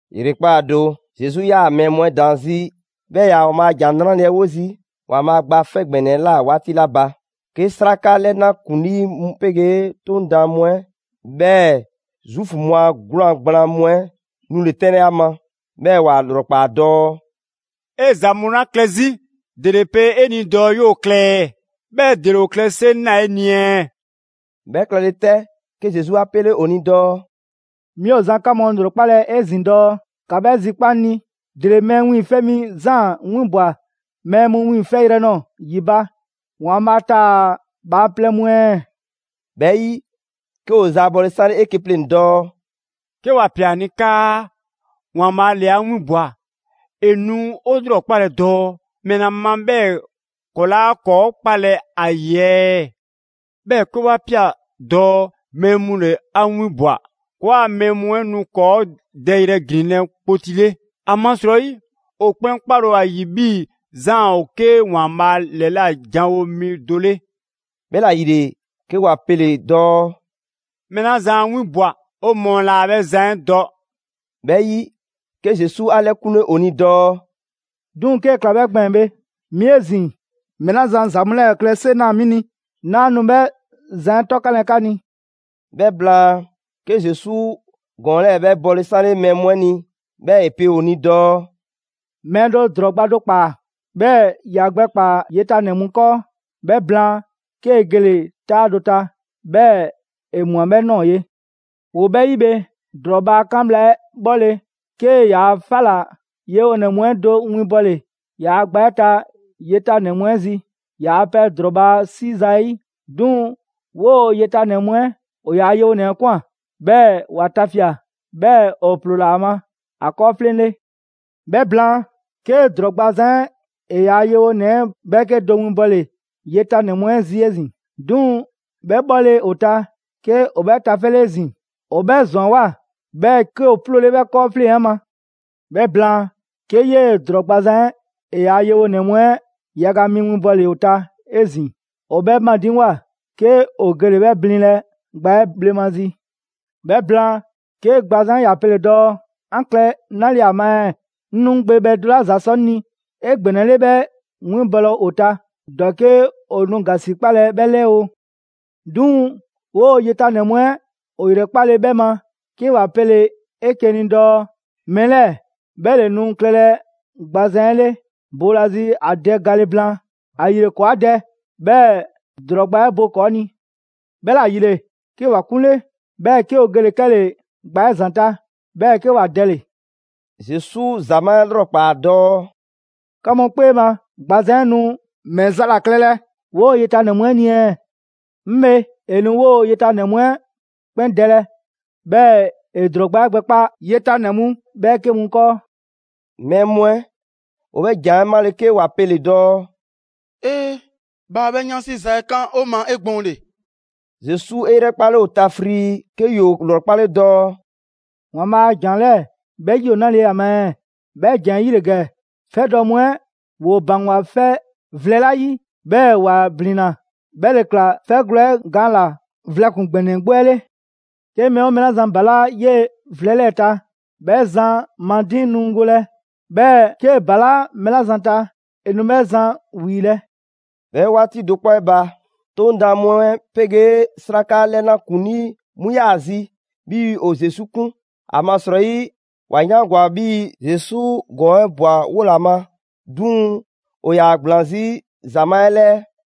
‑Yrekpaa' do, Zesu 'yaa‑ mɛɛ mu 'ɛ daan 'zi 'bhɛɛ‑ ‑e ‑yaa ‑Waanbhaa' ‑Jan 'Nrale‑ 'ɛ 'wo zii' ‑Waanbhaa' Gba 'Fɛ ‑Gbɛnɛ 'ɛ ꞊la 'waati 'la ba, 'ke 'sraka 'lɛna ‑kuŋlii mu 'pegee 'Toŋ daan mu 'ɛ, 'bhɛɛ‑ Zuufu mu a 'gwlaan gblaan mu 'ɛ 'nule 'tɛnlɛ‑ ‑a ma. 'Bhɛɛ‑ ‑wa ‑lrɔkpaa dɔɔ: «'E ‑za mu 'la klɛ 'zi, ‑dele pe 'e ni dɔɔ 'yoo‑ klɛ ɛɛ? 'Bhɛɛ‑ ‑dele ‑o klɛ 'seŋ ꞊naa 'e ni ɛɛ?» 'Bhɛ klɛle 'tɛ, 'ke Zesu 'a 'pele ‑o ni dɔɔ: «'Mi ‑o zan 'ka mu ‑lrɔkpalɛ 'ezin‑ dɔɔ: ‑Ka 'bhɛ zikpa' 'ŋ ni, ‑dele Mɛɛ Wiiŋfɛ' Mi Zaan 'winbwa‑ mɛɛ mu 'wiiŋfɛyrɛ nɔɔ‑ ‑yi ba, ‑Waanbhaa' taa‑ bhaaplɛŋ mu ɛɛ?» 'Bhɛ 'yi, 'ke ‑o zaabɔle 'sanle 'eke‑ pleŋ‑ dɔɔ: «'Ke 'wa ꞊pia ‑a ni 'kaa ‹‑Waanbhaa' ‑le 'a 'winbwa‑›, ‑e nu 'o 'lrɔkpalɛ dɔɔ ‑mɛla ma 'bhɛɛ‑ ‑kɔɔ' 'laa ‑kɔɔ' 'kpalɛ‑ ‑a ‑yi ɛɛ? 'Bhɛɛ‑ 'ke 'wa ꞊pia dɔɔ mɛɛ mu ‑le 'a 'winbwa‑, ‑kɔɔa' mɛɛ mu 'ɛ nu ‑kɔɔ' dɛyrɛ ‑glinlɛ' kpoti 'le. ‑Amasrɔyi ‑o 'kpɛn 'kpale‑ ‑o ‑a ‑yi 'bhii‑ Zaan ‑o 'ke ‑Waanbhaa' ‑lɛla' janwo mi do 'le.» 'Bhɛla‑ ‑yile, 'ke ‑wa pele‑ dɔɔ: «Mɛɛ 'la zan 'a 'winbwa‑ 'o mɔɔ laa 'bhɛ zan 'ɛ dɔ.» 'Bhɛ 'yi, 'ke Zesu 'a 'lɛkunle ‑o ni dɔɔ: «'Duŋ‑ 'kee‑ ꞊kla 'bhɛ gbɛɛn‑ bhe, 'mi 'ezin‑, mɛɛ 'la zan ‑za mu 'lɛɛ‑ klɛ 'seŋ ꞊naa 'mi ni, 'naa nu 'bhɛ zan 'ɛ 'tɔkanlɛ 'ka ni.» 'Bhɛ blaan, 'ke Zesu ‑gɔɔn 'lɛɛ‑ 'bhɛ bɔle 'sanle mɛɛ mu 'ɛ ni, 'bhɛɛ‑ ‑e pe ‑o ni dɔɔ: «Mɛɛ do ‑drɔɔ gba do ‑kpaa, 'bhɛɛ‑ ‑ya gbɛkpaa‑ yetanɛ mu 'kɔɔ‑. 'Bhɛ blaan, 'kee‑ gele‑ 'taa do ta, 'bhɛɛ‑ ‑e ꞊mwa 'bhɛ ꞊nɔɔ ye. ‑Woo 'bhɛ 'yi bhe, ‑drɔɔ bhaa 'kan bhla 'ɛ 'bhɔle‑, 'kee‑ ‑yaa' 'fɛ ꞊la yewonɛ mu 'ɛ do winbɔle ‑yaa' gba 'ɛ ta yetanɛ mu 'ɛ zi, ‑yaa' pɛ ‑drɔɔ bhaa 'si zayi'. 'Duŋ‑ 'woo‑ yetanɛ mu 'ɛ ‑o ‑yaa' yewonɛ 'ɛ ꞊kwan, 'bhɛɛ‑ ‑wa tafia꞊; 'bhɛɛ‑ ‑o ‑ploola ‑a ma ‑a 'kɔɔfleŋ‑ 'le. 'Bhɛ blaan, 'ke ‑drɔɔ gbazan 'ɛ ‑e ‑yaa' yewonɛ 'ɛ 'bhɛɛke do winbɔle yetanɛ mu 'ɛ zi ezin‑. 'Duŋ‑ 'bhɛ 'bhɔle‑ ‑o ta, 'ke ‑o 'bhɛ tafɛle 'ezin‑, ‑o 'bhɛ ‑zwanwoa, 'bhɛɛ‑ 'ke ‑o 'ploole 'bhɛ 'kɔɔfleŋ‑ 'ɛ ma. 'Bhɛ blaan, 'ke 'yee‑ ‑drɔɔ gbazan 'ɛ ‑e ‑yaa' yewonɛ mu 'ɛ yaga mi winbɔle ‑o ta 'ezin‑. ‑O 'bhɛ madiŋgwa, 'ke ‑o gele‑ 'bhɛ blinlɛ gba 'ɛ bhlemazi. 'Bhɛ blaan, 'ke gbazan 'ɛ ‑ya pele‑ dɔɔ: ‹'An klɛ 'nale‑ ‑a ma ɛɛ? 'Ŋ nu 'ŋ gbe bhɛ do 'la ‑za sɔ 'ŋ ni 'egbɛnɛle 'bhɛ winbɔlɛ ‑o ta, ‑dɔke' ‑o nu ‑gasikpalɛ 'bhɛ 'lɛɛ oo.› 'Duŋ‑ 'woo‑ yetanɛ mu 'ɛ ‑o ‑yrɛkpale 'bhɛ ma, 'ke ‑wa pele‑ 'eke‑ ni dɔɔ: ‹Mɛɛ 'lɛɛ‑ 'bhɛ ‑le nu klɛlɛ gbazan 'ɛ 'le boolazi ‑a dɛ gale blaan. ‑Ayile ‑kɔɔ' 'a dɛ, 'bhɛɛ‑ ‑drɔɔ gba 'ɛ bo ‑kɔɔ ni.› 'Bhɛla‑ ‑yile, 'ke ‑wa 'kunle, 'bhɛɛ 'ke ‑o gele‑ 'kɛle‑ gba 'ɛ ‑zanta', 'bhɛɛ‑ 'ke ‑wa dɛle‑.» Zesu ‑zamaa' 'ɛ 'lrɔkpaa‑ dɔɔ: «'Ka mu 'kpee ma, gbazan 'ɛ nu ‑mɛ za ‑la klɛlɛ 'woo‑ yetanɛ mu 'ɛ ni ɛɛ? 'Ŋ bhe, ‑e nu 'woo‑ yetanɛ mu 'ɛ 'kpɛn dɛlɛ, 'bhɛɛ‑ ‑e ‑drɔɔ gba 'ɛ gbɛkpa yetanɛ mu ‑bhɛɛke' mu 'kɔɔ.» Mɛɛ mu 'ɛ ‑o 'bhɛ ‑jan 'ɛ 'male‑ 'ke ‑wa pele‑ dɔɔ: «'Ee, bhaa 'bhɛ 'yansi za 'ɛ 'kan 'o ma 'egbɔɔnle.» Zesu 'e 'yrɛkpale ‑o ta frii, 'ke ‑yoo ‑lrɔkpale dɔɔ: «‑Waanbhaa' a ‑jan 'lɛɛ‑, 'bhɛ 'yi ‑o 'nale‑ ‑a ma ɛɛ? 'Bhɛ ‑jan 'ɛ 'yele‑ ‑gɛ: ‹'Fɛdɔ‑ mu 'ɛ ‑woo ‑baŋgwa vlɛ 'la 'yi 'bhɛɛ‑ ‑wa ‑blinna, 'bhɛ ‑le ꞊kla 'fɛgwlɛ‑ 'ɛ gaan ‑la vlɛ ‑kpuŋ ‑gbɛnɛ 'gbu 'ɛ.›» «'Ke mɛɛ 'oo mɛɛ 'la zan ‑balaa' 'yee‑ vlɛ 'lɛɛ‑ ta, 'bhɛ zan ma diiŋ nu golɛ. 'Bhɛɛ‑ 'kee‑ ‑balaa' mɛɛ 'la zan ta, ‑e nu 'bhɛ zan 'wiilɛ‑.» 'Bhɛ 'waati do 'kpɔ 'ɛ ba, 'Toŋ daan mu 'ɛ 'pegee 'sraka 'lɛna ‑kuŋlii mu 'yaa‑ zi 'bhii‑ ‑o Zesu 'kun. ‑Amasrɔyi ‑wa 'yaangwa‑ 'bhii‑, Zesu ‑gɔɔn 'ɛ ꞊bwa 'wo ‑la ma. 'Duŋ‑ ‑o ‑yaa ‑gblaan 'zi ‑zamaa' 'ɛ 'lɛɛ.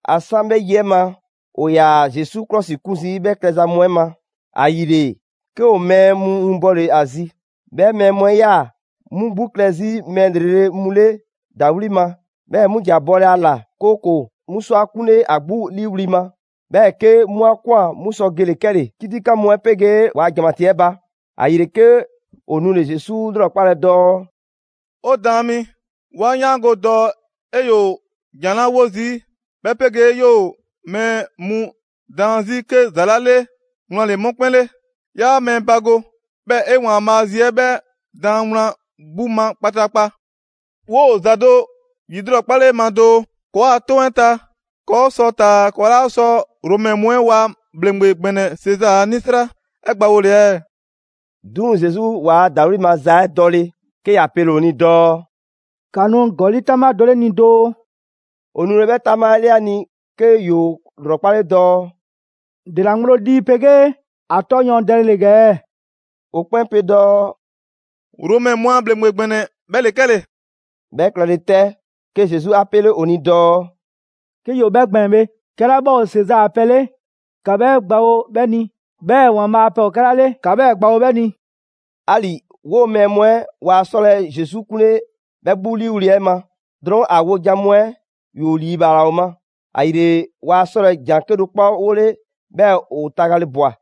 ‑A 'san 'bhɛ yi 'ɛ ma, ‑o ‑yaa Zesu 'klɔsikun zii' 'bhɛ klɛza mu 'ɛ ma. ‑Ayile 'ke ‑o mɛɛ mu winbɔle ‑a zi. 'Bhɛ mɛɛ mu 'ɛ 'yaa‑ 'mu 'gbu klɛ 'zi mɛɛ ‑lrele' mu 'le ‑dawli' ma. 'Bhɛ mu ‑ja bɔlɛ ‑a ‑la, 'kooko‑ 'mu sɔ ‑a 'kunle ‑a 'gbu 'liiwli‑ ma. 'Bhɛɛ‑ 'ke 'mu 'a ꞊kwan 'mu sɔ gele‑ 'kɛle‑ 'kitikan mu 'ɛ 'pegee ‑waa' ‑janmatii 'ɛ ba. ‑Ayile 'ke ‑o nule‑ Zesu 'lrɔkpalɛ dɔɔ: «'O Daan mi, 'wa 'yaango‑ dɔɔ 'e 'yoo‑ ‑jan 'la 'wo zii' 'bhɛ 'pegee 'yoo‑ mɛɛ daan mu 'zi 'ke ‑za 'la 'le, wlan ‑le 'mu 'kpɛn 'le. 'Yaa mɛɛ bago, 'bhɛɛ‑ 'e ‑Waanbhaa' a zi 'ɛ 'bhɛɛ‑ daan wlan 'gbu ma kpataakpa. 'Woo ‑za do ‑yilrɔkpale 'e ma doo: ‑Kɔɔa' 'toŋ‑ 'ɛ ta, ‑kɔɔ' sɔ taa‑ ‑kɔɔ' 'laa sɔ Romɛ mu 'ɛ ‑waa' ‑bhleŋgbe ‑gbɛnɛ Sezaa a 'nisra 'ɛ gbawole ɛɛ?» 'Duŋ‑ Zesu waa ‑dawli' maza 'ɛ dɔle, 'ke ‑ya pele‑ ‑o ni dɔɔ: «‑Ka nu ‑gɔli' 'taŋbha do 'le 'ŋ ni doo.» ‑O nule 'bhɛ 'taŋbha 'ɛ 'le ‑a ni, 'ke ‑yoo ‑lrɔkpale dɔɔ: «‑Dela ŋgblo lii 'pegee ‑a 'tɔ yɔɔndɛle ‑gɛ ɛɛ?» ‑O 'kpɛn pe dɔɔ: «Romɛ mu a ‑bhleŋgbe ‑gbɛnɛ 'bhɛ ‑le 'kɛle‑.» 'Bhɛ klɛle 'tɛ, 'ke Zesu 'a 'pele ‑o ni dɔɔ: «'Ke ‑yoo 'bhɛ gbɛɛn‑ bhe, 'kɛla 'bhɛ ‑o Sezaa a pɛ ‑o 'le, ‑ka 'bhɛɛ‑ gbawo 'bhɛ ni, 'bhɛɛ‑ ‑Waanbhaa' a pɛ ‑o 'kɛla 'le ‑ka 'bhɛ 'na 'bhɛ ni.» 'Ali‑ 'woo‑ mɛɛ mu 'ɛ waa 'sɔlɛ‑ Zesu 'kunle 'bhɛ 'gbu 'liiwli‑ 'ɛ ma. Drɔɔn' ‑a wojan mu 'ɛ ‑yoo ‑liibhaala ‑o ma. ‑Ayile waa 'sɔlɛ‑ ‑jan 'kedo‑ 'kpɔ 'wole, 'bhɛɛ‑ ‑o tagale ꞊bwa.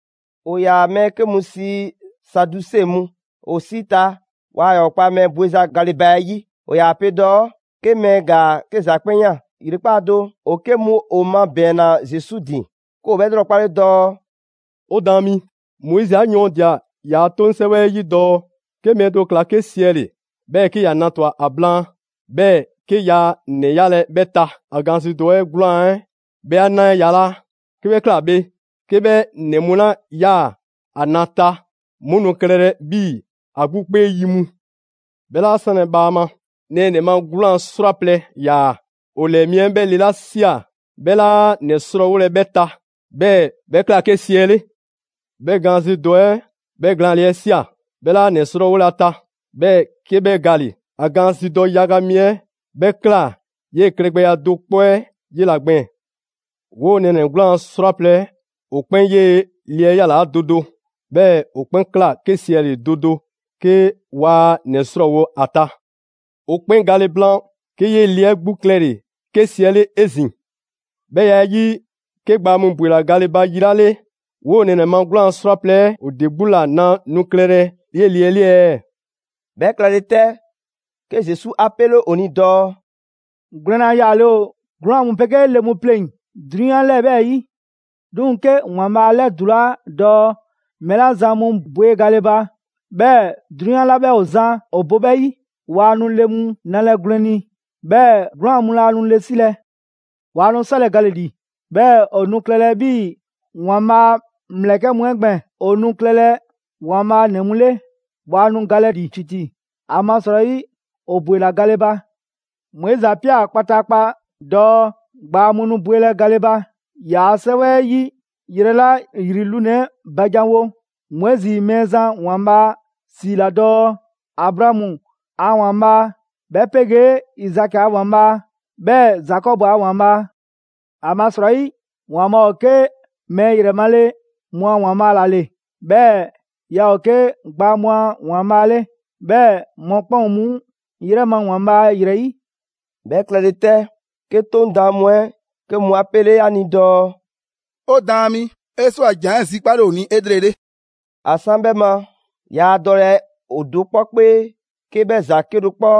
‑O ‑yaa mɛɛ 'ke mu sii Saduse mu, ‑o 'si ta waa ‑yaa ‑o kpa mɛɛ bweza gale ba 'ɛ 'yi. ‑O ‑yaa pe dɔɔ 'ke mɛɛ ‑gaa 'ke ‑za 'kpɛn ꞊yaan. ‑Yrekpaa' do, ‑o 'ke mu ‑o mabɛɛnna Zesu ‑din, 'ke ‑o 'bhɛ 'lrɔkpale dɔɔ: «'O Daan, Moizi 'a yɔɔndia‑ ‑yaa' 'toŋ 'sɛwɛ 'ɛ 'yi dɔɔ: 'Ke mɛɛ do ꞊kla 'ke 'siɛle‑, 'bhɛɛ‑ 'ke ‑ya na ‑twa ‑a blaan, 'bhɛɛ‑ 'ke yaa ‑nɛ 'yalɛ‑ 'bhɛ ta. ‑A gaanzidɔ dɔ 'ɛ 'gwlaan‑ 'ɛ 'bhɛ 'a na yalaa'. 'Ke 'bhɛ ꞊kla bhe, 'ke 'bhɛ ‑nɛ mu 'la ꞊yaa ‑a na ta, 'mu nu klɛlɛ 'bhii‑ ‑a 'gbu 'kpee 'yi mu. 'Bhɛ 'laa 'sanlɛ‑ bhaama, nɛɛnɛ‑ ma 'gwlaan‑ 'srwaplɛ‑ ‑yaa. ‑O ‑lɛɛ mi 'ɛ 'bhɛ le 'la ꞊sia 'bhɛ 'laa ‑nɛ 'srɔɔwolɛ 'bhɛ ta, 'bhɛɛ‑ 'bhɛ ꞊kla 'ke 'siɛle. 'Bhɛ gaanzidɔ dɔ 'ɛ, 'bhɛ glaanle 'ɛ ꞊sia, 'bhɛ 'laa ‑nɛ 'srɔɔwolɛ ‑a ta, 'bhɛɛ‑ 'ke 'bhɛ gale‑. ‑A gaanzidɔ dɔ yaga mi 'ɛ, 'bhɛ ꞊kla 'yee‑ klɛgbɛya do 'kpɔ 'ɛ 'yela‑ gbɛɛn‑. 'Woo‑ nɛɛnɛ‑ 'gwlaan 'srwaplɛ‑ ‑o 'kpɛn 'yee‑ le 'ɛ 'yalaa do do, 'bhɛɛ‑ ‑o 'kpɛn ꞊kla 'ke 'siɛle‑ do do 'ke waa ‑nɛ 'srɔɔwo‑ ‑a ta. ‑O 'kpɛn gale blaan, 'ke 'yee‑ le 'ɛ 'gbu klɛle‑ 'ke 'siɛle 'ezin‑. 'Bhɛ ya 'ɛ 'yi, 'ke gbaa mu ‑bwela gale ba yi 'la 'le, 'woo nɛɛnɛ‑ ma 'gwlaan‑ 'srwaplɛ‑ 'ɛ ‑o ‑de 'gbu ‑la na nu klɛlɛ 'yee‑ le 'ɛ 'le ɛɛ?» 'Bhɛ klɛle 'tɛ, 'ke Zesu 'a 'pele ‑o ni dɔɔ: «Gwlɛnna yaale ‑o 'gwlaan‑ mu 'pegee le mu pleŋ‑ 'drunyan 'lɛɛ‑ 'bhɛɛ‑ ‑yi. 'Duŋ‑ 'ke ‑Waanbhaa' 'a 'lɛdulaa dɔɔ mɛɛ 'la zan mu bwe gale ba, 'bhɛɛ‑ 'drunyan 'la 'bhɛ ‑o zan ‑o bo 'bhɛ 'yi, waa nu le mu nalɛ gwlɛn ni, 'bhɛɛ‑ 'gwlaan‑ mu laa nu le 'silɛ‑. Waa nu 'sɔlɛ‑ gale‑ ‑li, 'bhɛɛ‑ ‑o nu klɛlɛ 'bhii‑ ‑Waanbhaa' a ‑mlɛkɛ' mu 'ɛ gbɛɛn‑. ‑O nu klɛlɛ ‑Waanbhaa' ‑nɛ mu 'le, waa nu galɛ ‑li ‑titi, ‑amasrɔyi ‑o ‑bwela gale ba. Moizi 'a ꞊pia kpataakpa dɔɔ gbaa mu nu bwelɛ gale ba. ‑Yaa' 'sɛwɛ 'ɛ 'yi yrɛ 'la ‑yri lunɛ‑ 'ɛ ba janwo, Moizi Mɛɛzan ‑Waanbhaa' ‑siila dɔɔ: Abraamu a ‑Waanbhaa', 'bhɛ 'pegee Izaki a ‑Waanbhaa', 'bhɛɛ‑ Zakɔbu a ‑Waanbhaa'. ‑Amasrɔyi, ‑Waanbhaa' ‑o 'ke mɛɛ ‑yrɛ male mu a ‑Waanbhaa' ‑la ‑le, 'bhɛɛ‑ yaa ‑o 'ke gbaa mu a ‑Waanbhaa' 'le. 'Bhɛɛ‑ mɔkpɛn' ‑o 'mu 'yrɛ ma ‑Waanbhaa' ‑yrɛ 'yi.» 'Bhɛ klɛle 'tɛ, 'ke 'Toŋ daan mu 'ɛ 'ke mu 'a 'pele ‑a ni dɔɔ: «'O Daan mi, 'e 'swa‑ ‑jan 'ɛ zikpale ‑o ni 'elrele.» ‑A 'san 'bhɛ ma, yaa dɔlɛ ‑o do 'kpɔ 'kpee 'ke 'bhɛ ‑za 'kedo‑ 'kpɔ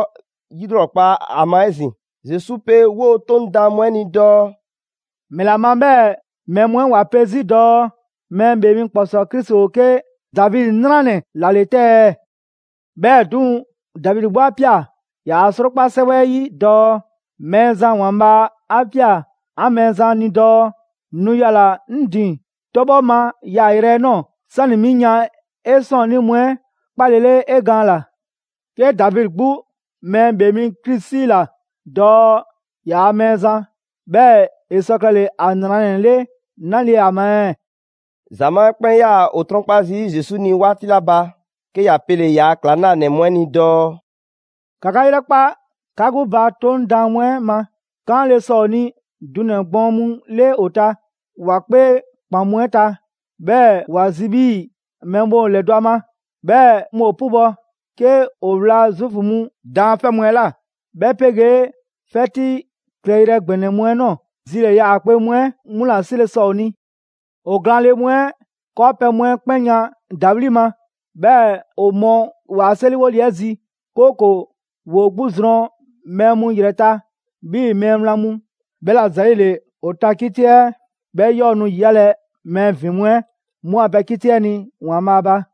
'yilrɔkpa ‑a ma 'ezin‑. Zesu pe 'woo‑ 'Toŋ daan mu 'ɛ ni dɔɔ: «‑Mɛla ma 'bhɛɛ‑ mɛɛ mu 'ɛ ‑wa pe 'zi dɔɔ Mɛɛ ‑Bhee Mi ‑Kpɔsɔɔ Krisi ‑o 'ke Davidi 'nranɛ‑ ‑la ‑le 'te ɛɛ? 'Bhɛɛ‑ 'duŋ‑, Davidi 'gbu 'a ꞊pia‑ ‑yaa' 'Srokpa 'sɛwɛ 'ɛ 'yi dɔɔ: ‹Mɛɛzan ‑Waanbhaa' 'a ꞊pia 'an Mɛɛzan ni dɔɔ: Nu yala‑ 'ŋ ‑din 'tɔbhɔ ma yaayrɛ 'ɛ ꞊nɔɔ. 'Sani‑ 'mi yan 'e ‑sɔɔnnii' mu 'ɛ kpaalele 'e gaan ꞊la.› «'Ke Davidi 'gbu Mɛɛ ‑Bhee mi Krisi 'siila‑ dɔɔ ‑yaa' Mɛɛzan. 'Bhɛɛ‑ ‑e sɔ klɛle‑ ‑a ‑nranɛ 'le 'nale‑ ‑a ma ɛɛ?» ‑Zamaa' 'ɛ 'kpɛn 'yaa‑ ‑o 'trɔnkpa zii' Zesu 'ni 'waati 'la ba, 'ke ‑ya pele‑ ‑yaa' ‑klaŋlanɛ mu 'ɛ ni dɔɔ: «‑Ka 'ka 'yrɛkpa 'ka 'gbu ba 'Toŋ daan mu 'ɛ ma. 'Kaanle‑ sɔ ‑o ni dunɛ‑ gbɔɔn mu 'le ‑o ta ‑wa 'kpee ‑kpan mu 'ɛ ta, 'bhɛɛ‑ ‑wa zi 'bhii‑ mɛɛ mu ‑o ‑lɛdɔ' ‑a ma, 'bhɛɛ‑ 'mu ‑o 'pubɔ‑. 'Ke ‑o ‑wlaa Zuufu mu daanfɛ' mu 'ɛ ꞊la, 'bhɛ 'pegee 'fɛti klɛyrɛ ‑gbɛnɛ mu 'ɛ ꞊nɔɔ, zilɛɛ‑ yaakpe mu 'ɛ 'mu ‑la 'sile‑ sɔ ‑o ni. ‑O glaanle mu 'ɛ 'kɔɔpɛ‑ mu 'ɛ 'kpɛn yan ‑dawli' ma. 'Bhɛɛ‑ ‑o mɔ ‑waa' 'seriwole 'ɛ zi, 'kooko‑ ‑woo 'gbu zrɔn mɛɛ mu ‑yrɛ ta 'bhii‑ mɛɛ wlan mu. 'Bhɛla‑ ‑zɛɛle, ‑o ta 'kiti 'ɛ 'bhɛ 'yɔɔ‑ nu ‑yiyalɛ mɛɛ ‑vin mu 'ɛ 'mu a pɛ 'kiti 'ɛ ni ‑Waanbhaa' ba.»